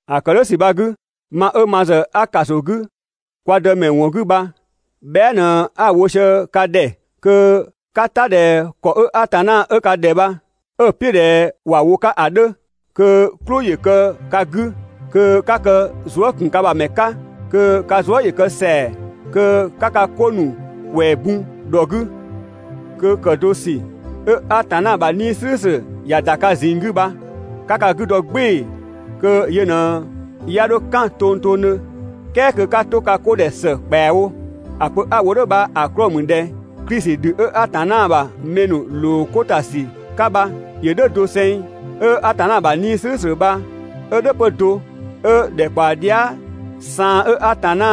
‑A ‑kë "dhʋ̈ ‑sü bha‑ 'gü, ma 'ö ma ‑zë a ‑kaso 'gü kwa Dëmɛ ‑wɔn 'gü bha bhɛa" ꞊në 'a‑ wo sië ka ‑dhɛ kö 'ka "ta ꞊dhɛ ‑kɔ 'ö Atanna 'ö ka ‑dhɛ bha 'ö‑ "piʋ̈ ꞊dhɛ ‑wa wo‑ 'ka ‑a 'dhö. Kö "klʋ ‑yö kë ka 'gü, kö 'ka kë zuë" ‑kun ka ‑bha ‑mɛ 'ka, kö ka zuë" ‑yö kë ‑sɛa, kö 'ka ka 'ko ‑nu ‑kwɛɛ bun ‑dhɔ 'gü, kö ‑kë do ‑sü 'ö Atanna ‑bha 'Nii‑ "slʋ̈ʋ̈slʋ̈ ‑ya ‑da ka ꞊zinng 'gü bha 'ka ka 'gü dɔ "gbɩɩ‑ kö yö ꞊në 'ya 'dho "kan tongtongdhö, "kɛɛ kö 'ka 'to ka 'ko ‑dhɛ ‑së ‑kpɛawo. ‑A pö 'a‑ wo "dhʋ̈ bha‑ 'klɔɔ‑ ‑mü ꞊dhɛ Klisi ‑dhü 'ö Atanna ‑bha mɛ ‑nu ‑loo 'ko ‑ta ‑sü 'ka bha, ‑yö "dhʋ̈ doseng, 'ö Atanna ‑bha 'Nii‑ "slʋ̈ʋ̈slʋ̈ bha 'ö "dhʋ̈ 'pö do, 'ö ‑dhɛkpaɔ dhia" saan 'ö Atanna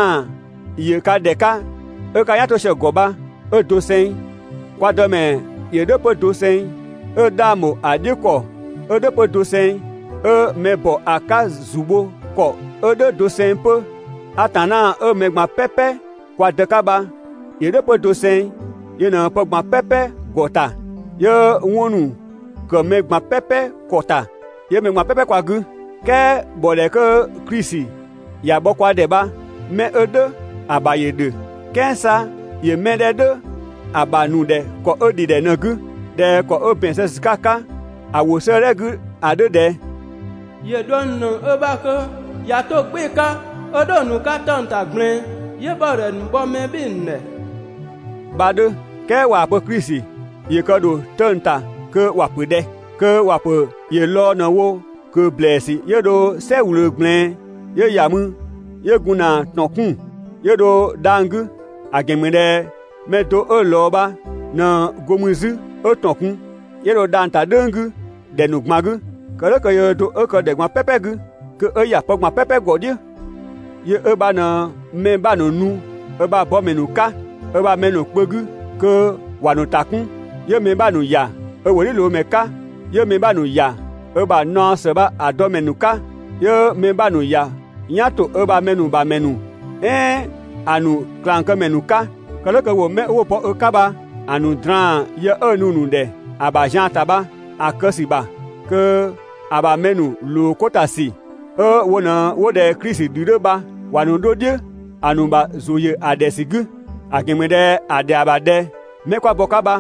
‑yö ka ‑dhɛ 'ka 'ö 'ka "yan 'to sië‑ ‑gɔ bha 'ö doseng. Kwa Dëmɛ ‑yö "dhʋ̈ 'pö doseng, 'ö 'dhang ‑bho ‑a "dhiʋ̈ ‑kɔ 'ö "dhʋ̈ 'pö doseng, 'ö mɛ ‑bɔ ‑a 'ka ‑zu bho ‑kɔ 'ö "dhʋ̈ doseng 'pö. Atanna 'ö mɛ ꞊gban "pɛpɛ kwa Dë 'ka bha ‑yö "dhʋ̈ 'pö doseng, yö ꞊në pë ꞊gban "pɛpɛ ‑gɔ ‑ta, 'yö 'wɔn ‑nu ‑kë mɛ ꞊gban "pɛpɛ ‑kɔ ‑ta, 'yö mɛ ꞊gban "pɛpɛ kwa 'gü. "Kɛɛ ‑bhɔdhɛ 'kö Klisi ‑ya bhɔ kwa ‑dhɛ bha mɛ 'ö "dhʋ̈ ‑a ‑bha ‑yö ‑dhö, "kɛɛ 'sa ‑yö 'mɛ 'dhɛ "dhʋ̈ ‑a ‑bha ‑nu ‑dhɛ ‑kɔ 'ö ‑dhidhɛ ꞊në‑ 'gü, ꞊dhɛ ‑kɔ 'ö ‑bɛn zë ‑sü 'ka‑ 'ka‑ ‑wʋ 'sëëdhɛ 'gü ‑a 'dhö ꞊dhɛ: ‑Yö ꞊dhuëng ‑nu ‑nëng ö ‑bha kö ꞊ya 'to‑ "gbɩɩ‑ 'ka 'ö dho‑ ‑nu 'ka 'tëng‑ ‑ta ꞊gblɛɛn, 'yö ‑bhɔdhɛ ‑nu bhɔ mɛ "bhɩɩ‑ ‑nu ‑dhɛ» bha‑ 'dhö. "Kɛɛ ꞊waa‑ pö Klisi ‑yö kë ‑dho 'tëng‑ ‑ta kö ‑wa pö ꞊dhɛ? Kö ‑wa ‑pö ‑yö lɔɔ‑ ꞊në‑ wo ꞊kö ‑blɛɛsü 'yö dho "sɛ ꞊wlöö ꞊gblɛɛn, 'yö ‑ya mü 'yö gun ‑na ‑tɔn 'kun‑ 'yö dho dhang‑ 'gü. ‑A ‑gɛn ‑mü ꞊dhɛ mɛ do 'ö ꞊lɔɔ bha ꞊në go mü 'zü 'ö ‑tɔn kun, 'yö dho dhang‑ ‑ta "dhʋ̈ng 'gü ‑dhɛ ‑nu ꞊gban 'gü. Kë "dhʋ̈ kö yöö do 'ö kë ‑dhɛ ꞊gban "pɛpɛ 'gü, kö 'ö ‑ya pë ꞊gban "pɛpɛ ‑gɔ "dhiʋ̈. Yö 'ö bha ꞊në mɛ 'bha ‑nu nu ö ‑bha bɔmɛ ‑nu 'ka ö ‑bha mɛ ‑nu kpö 'gü kö ‑wa ‑nu ‑ta 'kun, 'yö mɛ 'bha ‑nu ‑ya ö ‑wʋdhiʋ̈loomɛ 'ka, 'yö mɛ 'bha ‑nu ‑ya ö ‑bha naɔ ‑së bha‑ dɔmɛ ‑nu 'ka, 'yö‑ mɛ 'bha ‑nu ‑ya "yan ‑to ö ‑bha mɛ ‑nu ‑bha ‑mɛ ‑nu "ɛɛn ‑a ‑nu ꞊klangkëmɛ ‑nu 'ka. Kë "dhʋ̈ kö ‑wo 'mɛ 'wo bɔ ö 'ka bha‑ ‑nu draan‑ yë 'ö‑ nu‑ ‑nu ‑dhɛ ‑a ‑bha zian ‑ta bha‑ kë ‑sü ‑bha, kö ‑a ‑bha mɛ ‑nu ‑loo 'ko ‑ta ‑sü 'ö wo ꞊në 'wo ꞊dhɛ Klisi ‑dhü 'dhö bha ‑wa ‑nu 'dho "dhiʋ̈ ‑a ‑nu ‑bha ‑zʋ ‑yö ‑a ‑dhɛ ‑sü 'gü. ‑A ‑gɛn ‑mü ꞊dhɛ ‑a ‑dhɛa ‑bha ꞊dhɛ 'mɛ 'kwa bɔ‑ 'ka bha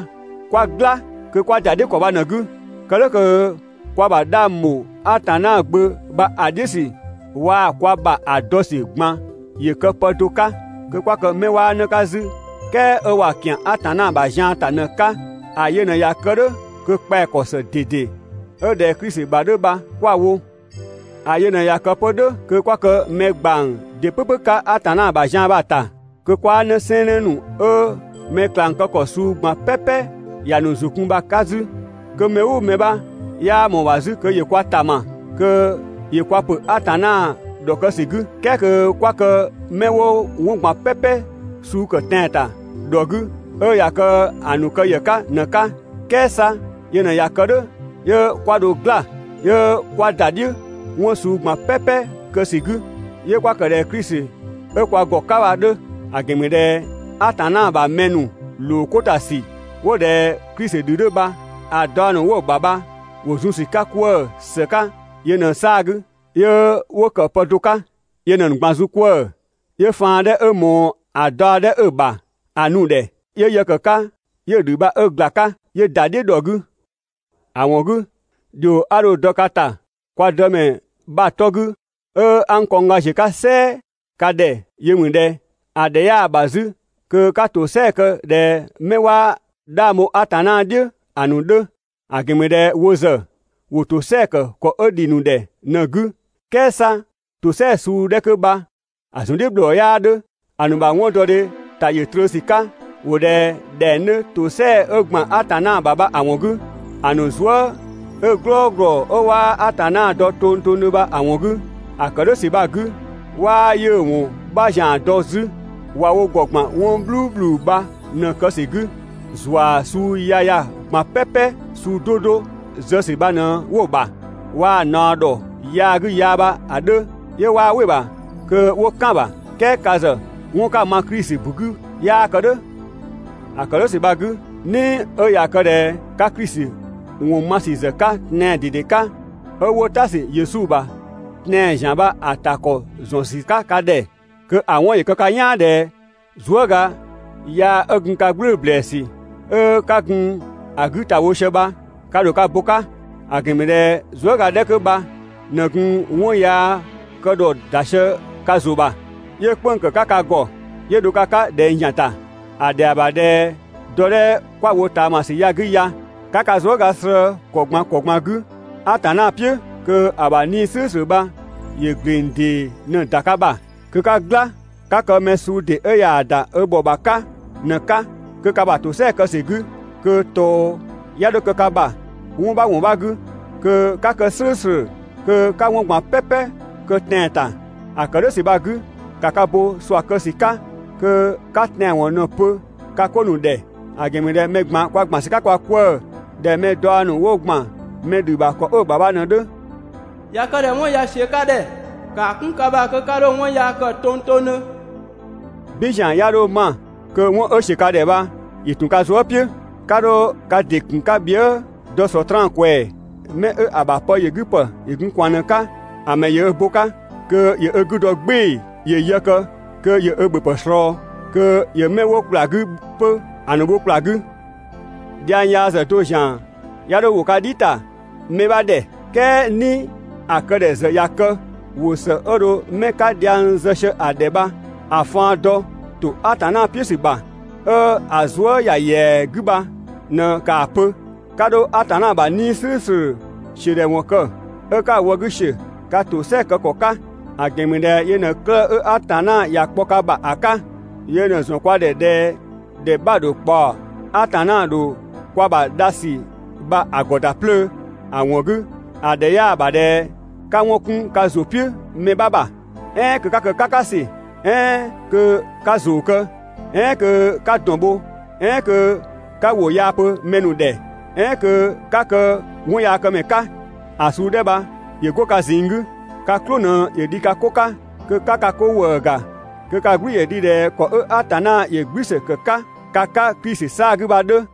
'kwa "gla kö 'kwa ‑da "dhiʋ̈ ‑kɔ bha ꞊në‑ 'gü. Kë "dhʋ̈ kö kwa ‑bha 'dhang ‑bho Atanna Gbö bha‑ "dhiʋ̈ ‑sü waa‑ kwa ‑bha ‑a dɔ ‑sü ꞊gban ‑yö kë pë do 'ka, kö 'kwa kë 'mɛ 'waa 'në 'ka 'zü, "kɛɛ 'ö ꞊wa ‑kian Atanna ‑bha zian ‑ta ꞊në‑ 'ka. ‑A yö ꞊në ꞊ya kë "dhʋ̈, kö kpɛa‑ ‑kɔ ‑së ꞊dede 'ö ꞊dhɛ Klisi ‑bha 'dhö bha 'kwa‑ wo. ‑A yö ꞊në ꞊ya kë 'pö "dhʋ̈ kö 'kwa kë mɛ ‑gbang ‑dɩ "pʋ̈pʋ̈ 'ka Atanna ‑bha zian bha‑ ‑ta, kö 'kwaa 'në sɛɛnnë ‑nu 'ö mɛ ꞊klang kë ‑kɔ suu ꞊gban "pɛpɛ ‑ya ‑nu ‑zʋ kun bha‑ 'ka 'zü, kö mɛ "ʋʋ mɛ 'bha 'yaa ꞊mɔɔ‑ ‑bha 'zü kö ‑yö kwa ‑ta ma kö ‑yö kwa ‑pö Atanna ‑dhɔkë ‑sü 'gü. "Kɛɛ kö 'kwa kë 'mɛ 'wo 'wɔn ꞊gban "pɛpɛ suu ‑kë tɛan‑ ‑ta, ‑dhɔ 'gü, 'ö ꞊ya kë ‑a ‑nu kë ‑yë 'ka ꞊në‑ 'ka. "Kɛɛ 'sa yö ꞊në ꞊ya kë "dhʋ̈, 'yö 'kwa dho "gla 'yö 'kwa ‑da "dhiʋ̈ 'wɔn suu ꞊gban "pɛpɛ kë ‑sü 'gü, 'yö 'kwa ‑kë ꞊dhɛ Klisi 'ö kwa ‑gɔ 'ka bha‑ 'dhö. ‑A ‑gɛn ‑mü ꞊dhɛ Atanna ‑bha mɛ ‑nu ‑loo 'ko ‑ta ‑sü 'wo ꞊dhɛ Klisi ‑dhü 'dhö bha‑ daɔ ‑nu 'wo‑ ‑bha bha ‑wo zun ‑sü 'ka 'kwëë‑ ‑së 'ka yö ꞊në‑ 'saa‑ 'gü, 'yö 'wo ‑kë pë do 'ka. Yö ꞊në‑ ‑nu ꞊gban zun 'kwëë‑, 'yö faan 'dhɛ 'ö ꞊mɔɔ ‑a daɔ 'dhɛ 'ö‑ ‑bha ‑a nu‑ ‑dhɛ 'yö yë ‑kë 'ka 'yö‑ ‑dhü bha 'ö ‑gla 'ka 'yö ‑da "dhiʋ̈ ‑dhɔ 'gü. ‑A ‑wɔn 'gü, ‑dhio 'a dho‑ dɔ ka ‑ta kwa Dëmɛ bha‑ 'tɔ 'gü 'ö 'a n kɔngga ‑ziö 'ka "sɛɛ ka ‑dhɛ yö ‑mü ꞊dhɛ: ‑A ‑dhɛ 'yaa‑ ‑bha 'zü kö 'ka ‑tosɛa kë ꞊dhɛ 'mɛ 'waa 'dhang bho Atanna "dhiʋ̈ ‑a ‑nu 'dhö. ‑A ‑gɛn ‑mü ꞊dhɛ wo ‑zë ‑wo ‑tosɛa ‑kë ‑kɔ 'ö ‑dhi ‑nu ‑dhɛ ꞊në‑ 'gü, "kɛɛ 'sa ‑tosɛa suu 'dhɛ 'kö bha‑ ‑zun "dhiʋ̈ bhlɔɔ 'yaa 'dhö ‑A ‑nu ‑bha 'wɔndɔdhe ‑ta ‑yö trö ‑sü 'ka, ‑wo ꞊dhɛ ‑dhɛng 'dhö ‑tosɛa 'ö ‑gban Atanna ‑bha bha‑ ‑wɔn 'gü, ‑a ‑nu zuë" 'ö "glɔɔglɔ 'ö 'waa Atanna dɔ tongtongdhö bha‑ ‑wɔn 'gü. ‑A ‑kë "dhʋ̈ ‑sü bha‑ 'gü 'waa 'yiʋ̈‑ ‑wɔn 'bha ‑zian dɔ 'zü, ꞊wa wo ‑gɔ ‑gban 'wɔn "bhluubhlu bha ꞊në‑ kë ‑sü 'gü, ‑zua suu yaya ꞊gban "pɛpɛ suu 'do 'do zë ‑sü bha ꞊në 'wo‑ ‑bha, waa‑ ꞊naɔ ‑dhɔ yaagü yaa bha‑ 'dhö 'yö 'waa "wɩ‑ ‑bha kö 'wo "kan‑ ‑bha. "Kɛɛ ka ‑zë 'wɔn 'ka‑ ma Klisi ‑bu 'gü 'yaa kë "dhʋ̈. ‑A ‑kë "dhʋ̈ ‑sü bha‑ 'gü, "ni 'ö ꞊ya kë ꞊dhɛ 'ka Klisi ‑wɔn ma ‑sü ‑zë 'ka tɛan‑ ꞊dede 'ka, 'ö 'wo "ta ‑sü Yesu ‑bha tɛan‑ ‑zian bha‑ ‑ta ‑kɔ ‑zë ‑zɔn ‑sü 'ka ka ‑dhɛ, kö‑ 'wɔn kë ka "yaan ꞊dhɛ zuëga yaa 'ö gun ka "gblʋ̈ʋ̈‑ ‑blɛɛsü 'ö 'ka gun‑ 'gü ‑ta wo sië bha, ka ‑dho ka bo‑ 'ka. ‑A ‑gɛn ‑mü ꞊dhɛ zuëga 'dhɛ 'kö bha ꞊në gun 'wɔn yaa kë ‑dhɔ ‑da sië ka ‑zʋ ‑bha 'yö "kpënng‑ ‑kë 'ka ka ‑gɔ 'yö dho ka 'ka ꞊dhɛng ‑zian ‑ta. ‑A ‑dhɛa ‑bha ꞊dhɛ dɔ 'dhɛ 'kwa‑ wo ꞊taamasü ya‑ 'gü ya, 'ka ka zuëga slëë‑ ‑kɔ ꞊gban ‑kɔ ꞊gban 'gü Atanna "piʋ̈ kö‑ ‑bha 'Nii‑ "slʋ̈ʋ̈slʋ̈ bha ‑yö ‑gleng ‑dee ꞊në‑ ‑da ka ‑bha. Kö 'ka "gla 'ka kë mɛ suu ‑dee 'ö ꞊yaa‑ ‑da ö bhɔ ‑bha 'ka ꞊në‑ 'ka, kö ka ‑bha ‑tosɛa kë ‑sü 'gü, kö ꞊tɔɔ 'ya 'dho kë ka ‑bha 'wɔn 'bha ‑wɔn 'bha 'gü, kö 'ka kë "slʋ̈ʋ̈slʋ̈, kö 'ka 'wɔn ꞊gban "pɛpɛ kë taan‑ ‑ta. ‑A kë "dhʋ̈ ‑sü bha‑ 'gü, ‑ka ka bo ꞊sua kë ‑sü 'ka kö 'ka tɛanwɔn ꞊në‑ pö ka 'ko ‑nu ‑dhɛ. ‑A ‑gɛn ‑mü ꞊dhɛ mɛ ꞊gban kwa ‑gban ‑sü 'ka kwa 'kwëë‑ ꞊dhɛ mɛ daɔ ‑nu 'wo ‑gban mɛ ‑dhü ‑bha ‑kɔ 'ö‑ ‑bha bha ꞊në‑ 'dhö. ꞊Ya kë ꞊dhɛ 'wɔn ꞊ya ‑siö ka ‑dhɛ, ‑kaa 'kun ka ‑bha kö 'ka 'dho 'wɔn yaa kë tongtongdhö. "Bin ‑zian 'ya 'dho 'ma kö 'wɔn 'ö ‑siö ka ‑dhɛ bha ‑yö ‑tun ka zuë" "piʋ̈. 'Ka 'dho ka ‑dɩ ‑kun 'ka bhië" dɔ Sɔtraan ꞊kwɛɛ‑. 'Mɛ ‑a ‑bha pë ‑yö 'gü ‑pë ‑yö gun ꞊kwaan ꞊në‑ 'ka, ‑a ‑mɛ ‑yö ö bo‑ 'ka kö ‑yö ö 'gü dɔ "gbɩɩ‑ ‑yö yë kë kö ‑yö ö ‑bhöpë ꞊slɔɔ, kö ‑yö 'mɛ 'wo ‑kpla 'gü 'pö‑ ‑nu bho ‑kpla 'gü. Dhiang yaa ‑zë do ‑zian 'ya 'dho ‑wo ka "dhi ‑ta mɛ 'bha ‑dhɛ, "kɛɛ "ni ‑a kë ‑dhɛ ‑zë ꞊ya kë, ‑wʋ ‑së 'ö dho 'mɛ 'ka dhiang zë sië‑ ‑dhɛ bha‑ faan dɔ ‑to Atanna "piʋ̈ ‑sü ‑bha, 'ö‑ zuë" ‑ya ‑yɛa 'gü bha ꞊në ‑kaa pö. 'Ka 'dho Atanna ‑bha 'Nii‑ "slʋ̈ʋ̈slʋ̈ ‑siö ‑dhɛ ‑wɔn kë 'ö 'ka‑ wë 'gü ‑siö ka ‑tosɛa kë ‑kɔ 'ka. ‑A ‑gɛn ‑mü ꞊dhɛ yö ꞊në 'klëë‑ 'ö Atanna ‑ya kpɔ ka ‑bha ‑a 'ka. Yö ꞊në‑ ‑zɔn kwa ‑dhɛ ꞊dhɛ ‑dhɛ 'bha‑ ‑dho kpaɔ, Atanna ‑dho kwa ‑bha dha ‑sü bha‑ ‑gɔ ‑da 'plöö. ‑A ‑wɔn 'gü, ‑a ‑dhɛ 'yaa‑ ‑bha ꞊dhɛ 'ka 'wɔn 'kun ka ‑zʋ "piʋ̈ mɛ 'bha ‑bha, "ɛɛn kö 'ka kë "kakasü, "ɛɛn kö 'ka ‑zoo kë, "ɛɛn kö 'ka ‑dɔn bho, "ɛɛn kö 'ka ‑wʋ yaa pö mɛ ‑nu ‑dhɛ, "ɛɛn kö 'ka kë 'wɔnyaakëmɛ ka. ‑A suu 'dhɛ bha ‑yö 'go ka ꞊zinng 'gü. Ka "klʋ ꞊në ‑yö dhi ka 'ko 'ka, kö 'ka ka 'ko ‑wëë ‑ga, kö ka "gblü ‑yö dhi ꞊dhɛ ‑kɔ 'ö Atanna ‑yö "gblü ‑së ‑kë 'ka ka 'ka Klisi 'saa‑ 'gü bha‑ 'dhö.